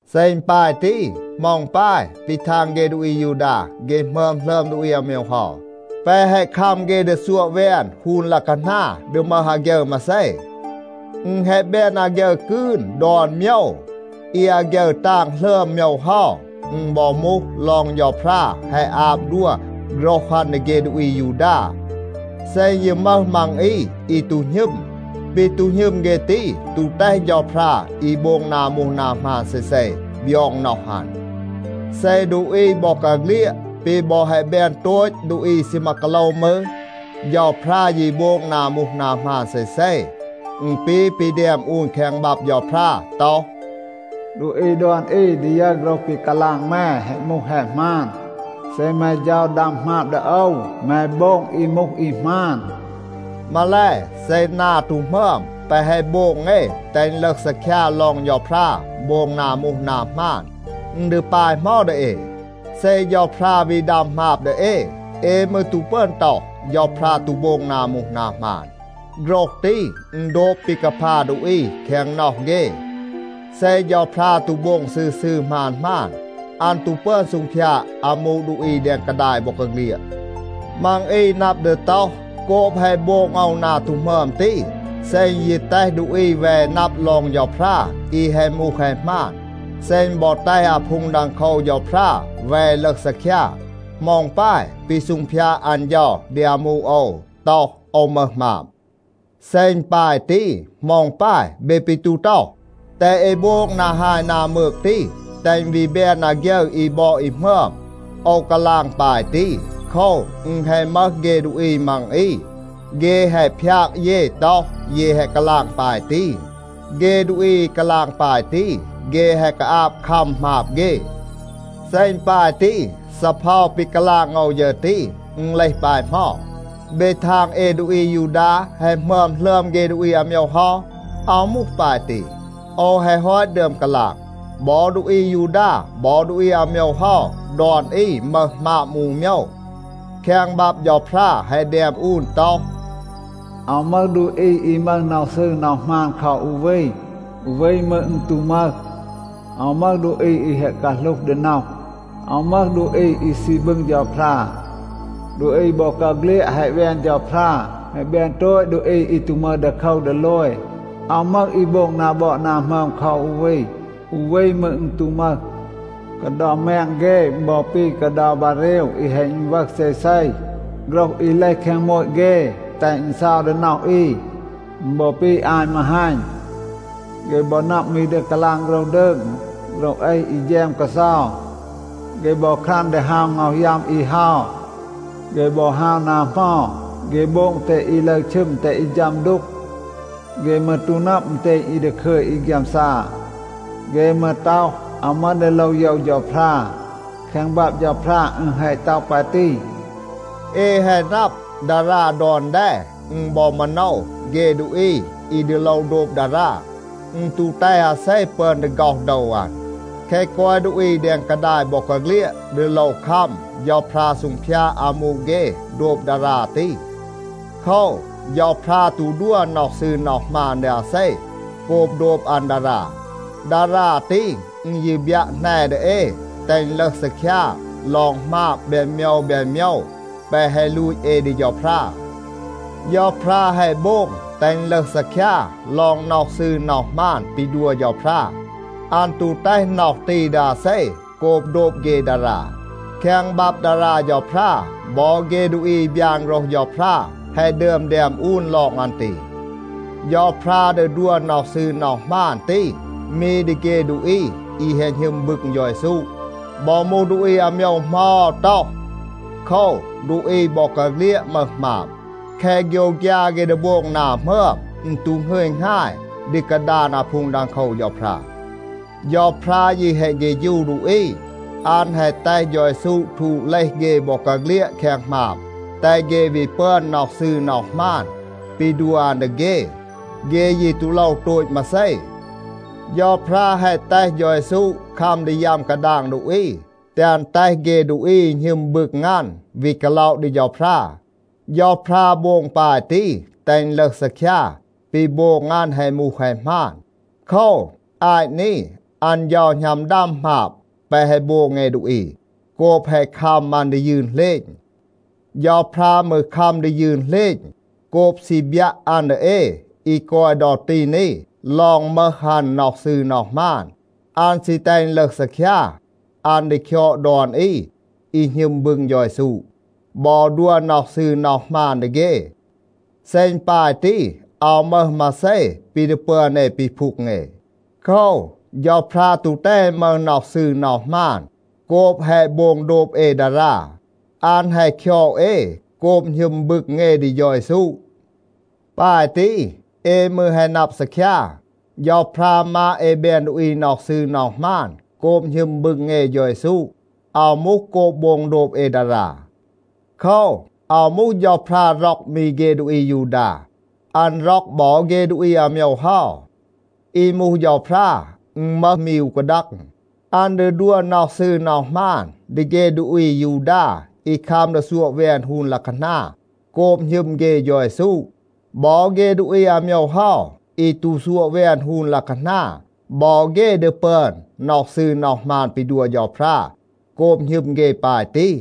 เซ อึณ ปาย ตี, เหมา อึณ ปาย ปี ทาง เฆ ดูอี อายูดา, เฆ หมึอม หลึอม ดูอี อาโมยว เฮา? แปะ แฮะ คัม เฆ ดี ซัวะ แวน ฮูน ลัะคานา ดี มึห อาฆยึร มาเซ? อึณ แฮะ แบน อาฆยึร กืน ดอน โมยว. อี อาฆยึร ตาง หลึอม โมยว เฮา, อึณ บอ มูห ลอง เฌาพรา แฮะ อาบ ดัว โฆรห อัน ดี เฆ ดูอี อายูดา. เซ อึณ ยี มึห มัง อี, อี ตู หณึม, ปี ตู หณึม เฆ ตี ตู แตห เฌาพรา อี โบง นา มูห นา หมาน เซเซ บยอง น็อห อัน. เซ ดูอี บอกาเฆลียด ปี บอ แฮะ แบน โตต ดูอี อี ซีมา กาโลว มืร, เฌาพรา ยี โบง นา มูห นา หมาน เซเซ. อึณ ปี ปี แดม อูน แคง บับ เฌาพรา ต็อห, “ดูอี ดอน อี ดี ยึร โฆรห ปี กาลาง แม แฮะ มูห แฮะ หมาน. เซ แม เฌา ดัม หมาบ ดี โอว, แม โบง อี มูห อี หมาน.” มาแล, เซ นา ตู หมึอม แปะ แฮะ โบง เอ แตห อึณ ลึห ซีคยา ลอง เฌาพรา โบง นา มูห นา หมาน, อึณ ดี ปาย เหมา ดี เอ? เซ เฌาพรา วี ดัม หมาบ ดี เอ, เอ มืร ตู ปึอน ต็อห, เฌาพรา ตู โบง นา มูห นา หมาน. (โฆรห ตี, อึณ โดบ ปี กาพา ดูอี แคง น็อห เฆ). เซ เฌาพรา ตู โบง ซืร ซืร หมาน หมาน, อัน ตู ปึอน ซูงพยาด อามู ดูอี แดง กาดาย บอกาเฆลียด. มัง อี นับ ดี ต็อห, โกบ แฮะ โบง โอว นา ตู หมึอม ตี, เซ อึณ ยี แตห ดูอี แว นับ ลอง เฌาพรา อี แฮะ มูห แฮะ หมาน, เซ อึณ บอ แตห อาพูง ดังโคว เฌาพรา แว ลึห ซีคยา, เหมา อึณ ปาย ปี ซูงพยาด อัน เฌา ดี อามู โอว ต็อห, โอว มึห หมาบ? เซ อึณ ปาย ตี, เหมา อึณ ปาย เบ ปี ตู ต็อห, แตห เอ โบง นา ฮาย นา มืก ตี, แตห อึณ วี แบน อาฆยึร อี บอด อี หมึอม? โอว กาลาง ปาย ตี, โคว, อึณ แฮะ มึห เฆ ดูอี มัง อี, เฆ แฮะ พยาก เย ต็อห, เย แฮะ กาลาง ปาย ตี. เฆ ดูอี อี กาลาง ปาย ตี, เฆ แฮะ กาอาบ คัม หมาบ เฆ. เซ อึณ ปาย ตี, ซีเพา ปี กาลาง โอว ฌึร ตี, อึณ เลห ปาย เหมา? เบ ทาง เอ ดูอี อายูดา แฮะ หมึอม หลึอม เฆ ดูอี อาโมยว เฮา? อาว มูห ปาย ตี. โอว แฮะ ฮอต ดึอม กาลาง, บอ ดูอี อายูดา บอ ดูอี อาโมยว เฮา ดอน อี มึห หมาบ มูห อู โมยว. แคง บับ เฌาพรา แฮะ แดม อูน ต็อห, “อาว มึห ดูอี อี มึห น็อห ซืร น็อห หมาน คอ อู วี. อู วี มืร อึณ ตู มึห. อาว มึห ดูอี อี แฮะ กาหลูห ดี น็อห. อาว มึห ดูอี อี ซี บึง เฌาพรา. ดูอี บอกาเฆลียด แฮะ แวน เฌาพรา, แฮะ แบน โตต ดูอี อี ตู มึห ดีโคว ดีโลย. อาว มึห อี โบง นา บอด นา หมึอม คอ อู วี. อู วี มืร อึณ ตู มึห. กาเดา แมง เฆ, อึณ บอ ปี กาเดา บาเรว อี แฮะ อึณวึห เซเซ. โฆรห อี เลห แคง โมต เฆ แตห อึณ เซา ดี น็อห อี. อึณ บอ ปี อาย มาฮัณ. เฆ บอ นับ มี ดี กาลาง โฆรห ดืง, โฆรห เอห อี แฌม กาเซา. เฆ บอ ครัน ดี ฮาว ง็อห ยัม อี เฮา. เฆ บอ ฮาว นา เหมา, เฆ โบง แตห อี ลึร ชึม, แตห อี ฌัม ดูก. เฆ มืร ตู นับ อึณเตณ อี ดาคึย อี ฆยามซา. เฆ มืร ต็อห, ‘อาว มึห ดี โลว โยว เฌาพรา.’” แคง บับ เฌาพรา อึณ แฮะ ต็อห ปาย ตี. เอ แฮะ นับ, ดารา ดอน แด, อึณ บอ มาโนว เฆ ดูอี อี ดี โลว โดบ ดารา. อึณ ตู แตห อาเซ ปึอน ดี ฆ็อห โดว อัน. แคะ กอย ดูอี แดง กาดาย บอกาเฆลียด ดี โลว คัม เฌาพรา ซูงพยาด อามู เฆ โดบ ดารา ตี. โคว, เฌาพรา ตู ดัว น็อห ซืร น็อห หมาน ดี อาเซ โกบ โดบ อัน ดารา. ดารา ตี, อึณ ยี บยัะ แหน ดี เอ, แตห อึณ ลึห ซีคยา ลอง หมาบ แบน โมยว แบน โมยว แปะ แฮะ ลูต เอ ดี เฌาพรา. เฌาพรา แฮะ โบง แตห อึณ ลึห ซีคยา ลอง น็อห ซืร น็อห หมาน ปี ดัว เฌาพรา. อัน ตู แตห น็อห ตี ดี อาเซ โกบ โดบ เฆ ดารา. แคง บับ ดารา เฌาพรา บอ เฆ ดูอี อี บยาน โฆรห เฌาพรา แฮะ ดึอม แดม อูน ลอง อัน ตี. เฌาพรา ดี ดัว น็อห ซืร น็อห หมาน ตี มี ดี เฆ ดูอี อี แฮะ หณึม บึง เฌา เยซู. บอ มูห ดูอี อาโมยว เหมา, อาว ต็อห. โคว, ดูอี บอกาเฆลียด มึห หมาบ. แคะ โฆยวฆยา เฆ ดี โบง นา หมึอม, อึณ ตู หงึย หงาย ดี กาดาน อาพูง ดังโคว เฌาพรา. เฌาพรา ยี แฮะ เฆฌู ดูอี. อัน แฮะ แตห เฌา เยซู ทูด เลห เฆ บอกาเฆลียด แคง หมาบ, แตห เฆ วี ปึอน น็อห ซืร น็อห หมาน ปี ดัว อัน ดี เฆ. เฆ ยี ตู โลว โตต มาเซ. เฌาพรา แฮะ แตห เฌา เยซู คัม ดี ยัม กาดาง ดูอี, แตห อัน แตห เฆ ดูอี อี หณึม บึง อัน วี กาล็อะ ดี เฌาพรา. เฌาพรา โบง ปาย ตี, แตห อึณ ลึห ซีคยา, ปี โบง อัน แฮะ มูห แฮะ หมาน. โคว, อาต นี อัน เฌา หณัม ดัม หมาบ แปะ แฮะ โบง เอ ดูอี โกบ แฮะ คัม อัน ดี ยืน เหลณ. เฌาพรา มืร คัม ดี ยืน เหลณ โกบ ซี บยัะ อัน ดี เอ อี กอย ดอ ตี นี ลอง มึห อัน น็อห ซืร น็อห หมาน. อัน ซี แตห อึณ ลึห ซีคยา, อัน ดี คยอด ดอน อี อี หณึม บึง เฌา เยซู บอ ดัว น็อห ซืร น็อห หมาน ดี เฆ. เซ อึณ ปาย ตี, อาว มึห มาเซ ปี ดี ปึอน เอ ปีพูง เอ. โคว, เฌาพรา ตู แตห เอ มึห น็อห ซืร น็อห หมาน โกบ แฮะ โบง โดบ เอ ดารา. อัน แฮะ คยอด เอ โกบ หณึม บึง เอ ดี เฌา เยซู. ปาย ตี, เอ มืร แฮะ นับ ซีคยา, เฌาพรา มาด เอ แบน ดูอี น็อห ซืร น็อห หมาน โกบ หณึม บึง เอ เฌา เยซู. อาว มูห โกบ โบง โดบ เอ ดารา. โคว, อาว มูห, เฌาพรา ร็อก มี เฆ ดูอี อายูดา. อัน ร็อก บอ เฆ ดูอี อาโมยว เฮา. อี มูห เฌาพรา, อึณ มึห มี อู กาดัง. อัน ดี ดัว น็อห ซืร น็อห หมาน ดี เฆ ดูอี อายูดา อี คัม ดี ซัวะ แวน ฮูน ลัะคานา, โกบ หณึม เฆ เฌา เยซู. บอ เฆ ดูอี อาโมยว เฮา อี ตู ซัวะ แวน ฮูน ลัะคานา, บอ เฆ ดี ปึอน น็อห ซืร น็อห หมาน ปี ดัว เฌาพรา โกบ หณึม เฆ ปาย ตี.